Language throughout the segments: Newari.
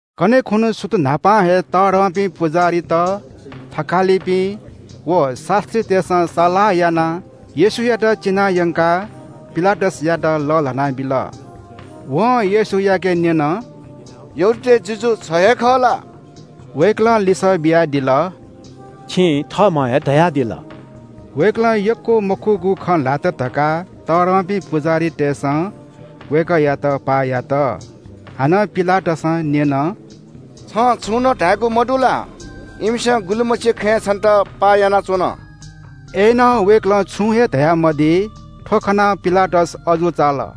कन्‍हय् खुन्‍हु सुथ न्‍हापां हे तःधंपिं पुजाहारीत, थकालिपिं व शास्‍त्रीतय्‌सं सल्‍लाह यानाः येशूयात चिनायंकाः पिलातसयात लःल्‍हाना बिल। वं येशूयाके न्‍यन – “यहूदीतय् जुजु छ हे खः ला?” वय्‌कलं लिसः बियादिल – “छिं थःम्‍हं हे धयादिल।” वय्‌कलं यक्‍व मखुगु खँ ल्‍हात धकाः तःधंपिं पुजाहारीतय्‌सं वय्‌कःयात पाः यात। हानं पिलातसं न्‍यन – “छं छुं नं धायेगु मदु ला? इमिसं गुलिमछि खँय् छन्‍त पाः यानाच्‍वन।” अय्‌नं वय्‌कलं छुं हे धयामदी। थ्‍व खनाः पिलातस अजू चाल।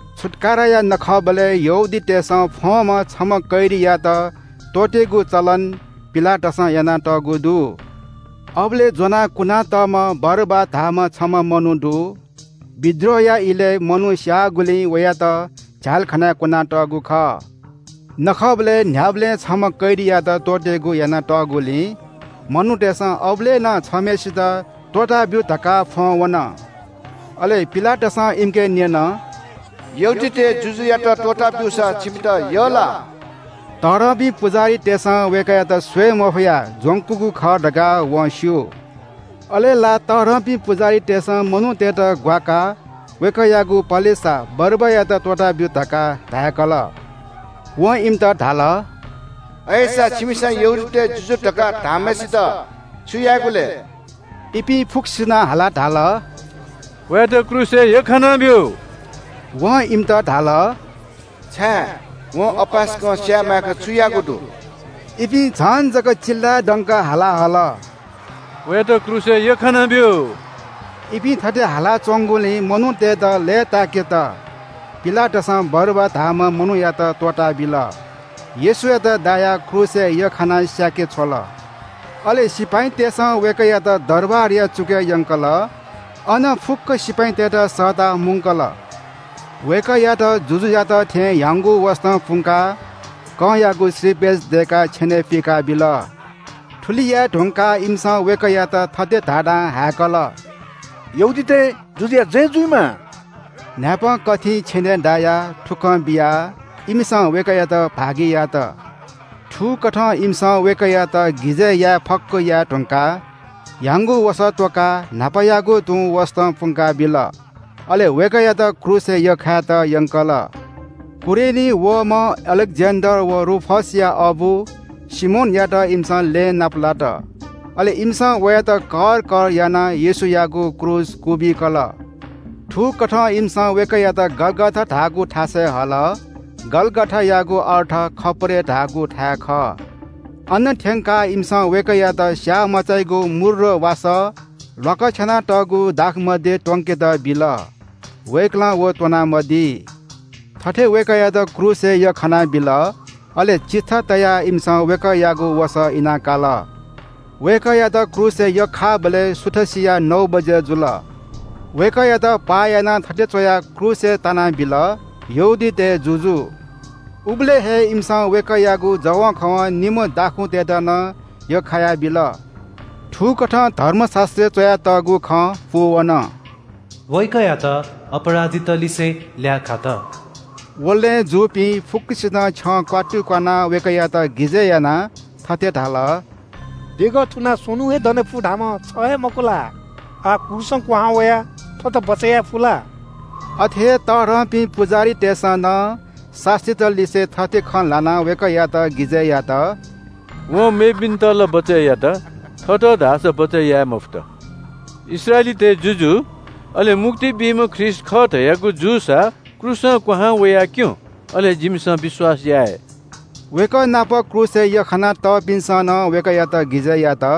छुत्‍काराया नखःबलय् यहूदीतय्‌सं फ्‍वंम्‍ह छम्‍ह कैदीयात त्‍वःतेगु चलन पिलातसं यानातःगु दु। अबलय् ज्‍वनाः कुनातःम्‍ह बरब्‍बा धाःम्‍ह छम्‍ह मनू दु। बिद्रोहया इलय् मनू स्‍याःगुलिं वयात झ्‍यालखानाय् कुना तःगु खः। न्‍ह्याबलें नखःबलय् छम्‍ह कैदीयात त्‍वःतेगु यानातःगुलिं मनूतय्‌सं अबलय् नं छम्‍हय्‌सित त्‍वःताब्‍यु धकाः फ्‍वं वन। अले पिलातसं इमिके न्‍यन – “यहूदीतय् जुजुयात त्‍वःता ब्‍यूसा छिमित यः ला?” तःधंपिं पुजाहारीतय्‌सं वय्‌कःयात स्‍वये मफयाः ज्‍वंकूगु खः धकाः वं स्‍यू। अले ला तःधंपिं पुजाहारीतय्‌सं मनूतय्‌त ग्‍वाकाः वय्‌कःयागु पलेसा बरब्‍बायात त्‍वःताब्‍यु धकाः धाय्‌कल। वं इमित धाल – “अय्‌सा छिमिसं यहूदीतय् जुजु धकाः धाःम्‍हय्‌सित छु यायेगु लय्?” इपिं फुक्‍कसिनं हालाः धाल – “वयात क्रूसय् यख्‍खानाब्‍यु।” वं इमित धाल – “छाय्, वं अपाय्‌सकं स्‍याये मायेक छु याःगु दु?” इपिं झन जक चिल्‍लाय्‌दंक हाला हल – “वयात क्रूसय् यख्‍खानाब्‍यु।” इपिं थथे हालाच्‍वंगुलिं मनूतय्‌त लय्‌ताय्‌केत पिलातसं बरब्‍बा धाःम्‍ह मनूयात त्‍वःताबिल। येशूयात दायाः क्रूसय् यख्‍खाना स्‍याके छ्वल। अले सिपाइँतय्‌सं वय्‌कःयात दरबारया चुकय् यंकल। अन फुक्‍क सिपाइँतय्‌त सःताः मुंकल। वय्‌कःयात जुजुयात थें ह्याउँगु वसतं पुंकाः कंयागु श्रीपेच दय्‌काः छेनय् पुइकाबिल। थुलि याये धुंकाः इमिसं वय्‌कःयात थथे धाधां हाय्‌कल – “यहूदीतय् जुजुया जय जुइमा।” न्‍हाय्‌पं कथिं छेनय् दायाः थुकलं बियाः इमिसं वय्‌कःयात भागि यात। थुकथं इमिसं वय्‌कःयात गिजय् याये फक्‍व याये धुंकाः ह्याउँगु वसः त्‍वकाः न्‍हापायागु तुं वसतं पुंका बिल। अले वय्‌कःयात क्रूसय् यख्‍खायेत यंकल। कुरेनीं वःम्‍ह अलेक्‍जेन्‍डर व रूफसया अबु सिमोनयात इमिसं लँय् नापलात। अले इमिसं वयात कर कर यानाः येशूयागु क्रूस क्‍वबिकल। थुकथं इमिसं वय्‌कःयात गलगथा धाःगु थासय् हल। गलगथायागु अर्थ खप्‍परे धाःगु थाय् खः। अन थ्‍यंकाः इमिसं वय्‌कःयात स्‍याःमचाइगु मूर्र वासः ल्‍वाकछ्यानातःगु दाखमद्य त्‍वनेत बिल, वय्‌कलं व त्‍वना मदी। थथे वय्‌कःयात क्रूसय् यख्‍खानाबिल। अले चिट्ठा तयाः इमिसं वय्‌कःयागु वसः इना काल। वय्‌कःयात क्रूसय् यख्‍खाःबलय् सुथसिया नौ बजे जुल। वय्‌कःयात पाः यानाः थथे च्‍वयाः क्रूसय् तानाबिल – “यहूदीतय् जुजु।” उबलय् हे इमिसं वय्‌कःयागु जवंखवं निम्‍ह दाखुँतय्‌त नं यख्‍खायाबिल। थुकथं धर्मशास्‍त्रय् च्‍वयातःगु खँ पूवन – “वय्‌कःयात अपराधीत लिसे ल्‍याः खात।” व लँय् जूपिं फुक्‍कसिनं छ्यं क्‍वात्तु क्‍वानाः वय्‌कःयात गिजय् यानाः थथे धाल – “देगः थुनाः स्‍वन्‍हुं हे दने फु धाःम्‍ह छ हे मखु ला? आः क्रूसं क्‍वहां वयाः थःत बचय् याये फु ला?” अथे हे तःधंपिं पुजाहारीतय्‌सं नं शास्‍त्रीत लिसे थथे खँ ल्‍हानाः वय्‌कःयात गिजय् यात – “वं मेपिन्‍त ला बचय् यात, थःत धाःसा बचय् याये मफुत। इस्राएलीतय् जुजु, अले मुक्ति बीम्‍ह ख्रीष्‍ट खः धयागु जूसा क्रूसं क्‍वहां वयाः क्‍यँ। अले जिमिसं विश्‍वास याये।” वय्‌कः नाप क्रूसय् यख्‍खाया तःपिन्‍सं नं वय्‌कःयात गिजय् यात।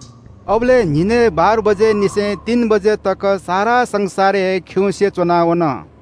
अबलय् न्‍हिनय् बाह्र बजेनिसें तीन बजे तक सारा संसार हे खिउँसे च्‍वना वन।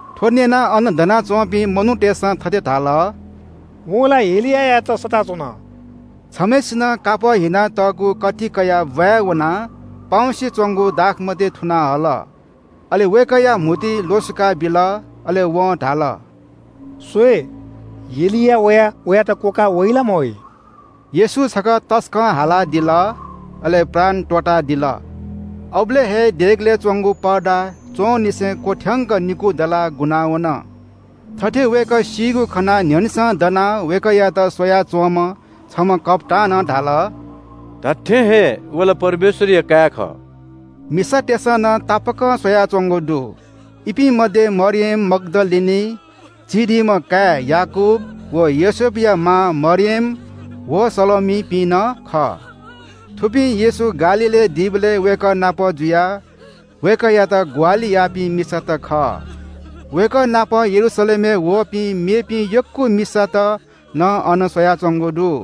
थ्‍व न्‍यनाः अन दनाच्‍वंपिं मनूतय्‌सं थथे धाल – “वं ला एलियायात सःता च्‍वन।” छम्‍हय्‌सिनं कापः हिनातःगु कथि कयाः ब्‍वाँय् वनाः पाउँसे च्‍वंगु दाखमद्य थुनाः हल, अले वय्‌कःया म्‍हुतुइ ल्‍वसुकाबिल। अले वं धाल – “स्‍वये, एलिया वयाः वयात क्‍वकाः वइ ला मवइ।” येशू छकः तसकं हालादिल, अले प्राण त्‍वःतादिल। अबलय् हे देगलय् च्‍वंगु पर्दा च्‍वंनिसें क्‍वथ्‍यंक निकू दलाः गुना वन। थथे वय्‌कः सीगु खनाः न्‍ह्यःनेसं दनाः वय्‌कःयात स्‍वया च्‍वंम्‍ह छम्‍ह कप्‍तानं धाल – “धात्‍थें हे व ला परमेश्‍वरया काय् खः।” मिसातय्‌सं नं तापाकं स्‍वयाच्‍वंगु दु। इपिं मध्‍ये मरियम मग्‍दलिनी, चिधीम्‍ह काय् याकूब व योसेफया मां मरियम व सलोमीपिं नं खः। थुपिं येशू गालीलय् दीबलय् वय्‌कः नाप जुयाः वय्‌कःयात ग्‍वाहालि याःपिं मिसात खः। वय्‌कः नाप यरूशलेमय् वःपिं मेपिं यक्‍व मिसात नं अन स्‍वयाच्‍वंगु दु।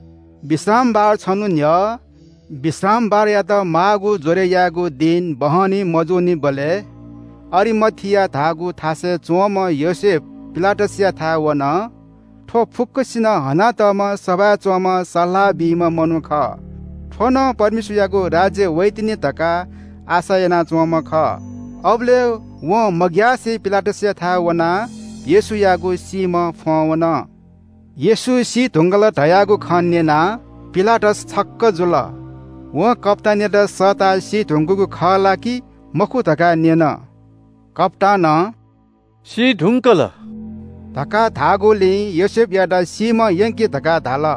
विश्रामबार छन्‍हु न्‍ह्यः विश्रामबारयात माःगु ज्‍वरय् यायेगु दिं बहनी मजूनिबलय् अरिमथिया धाःगु थासय् च्‍वंम्‍ह योसेफ पिलातसयाथाय् वन। थ्‍व फुक्‍कसिनं हनातःम्‍ह सभाय् च्‍वंम्‍ह सल्‍लाह बीम्‍ह मनू खः। थ्‍व नं परमेश्‍वरयागु राज्‍य वइतिनि धकाः आशा यानाच्‍वंम्‍ह खः। अबलय् वं मग्‍यासे पिलातसयाथाय् वनाः येशूयागु सीम्‍ह फ्‍वं वन। येशू सी धुंकल धयागु खँ न्‍यनाः पिलातस छक्‍क जुल। वं कप्‍तानयात सःताः सी धुंकूगु खः ला कि मखु धकाः न्‍यन। कप्‍तानं “सी धुंकल” धकाः धाःगुलिं योसेफयात सीम्‍ह यंकि धकाः धाल।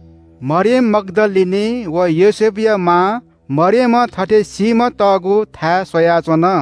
मरियम मग्‍दलिनी व योसेफया मां मरियमं थथे सीम्‍ह तःगु स्‍वयाच्‍वन।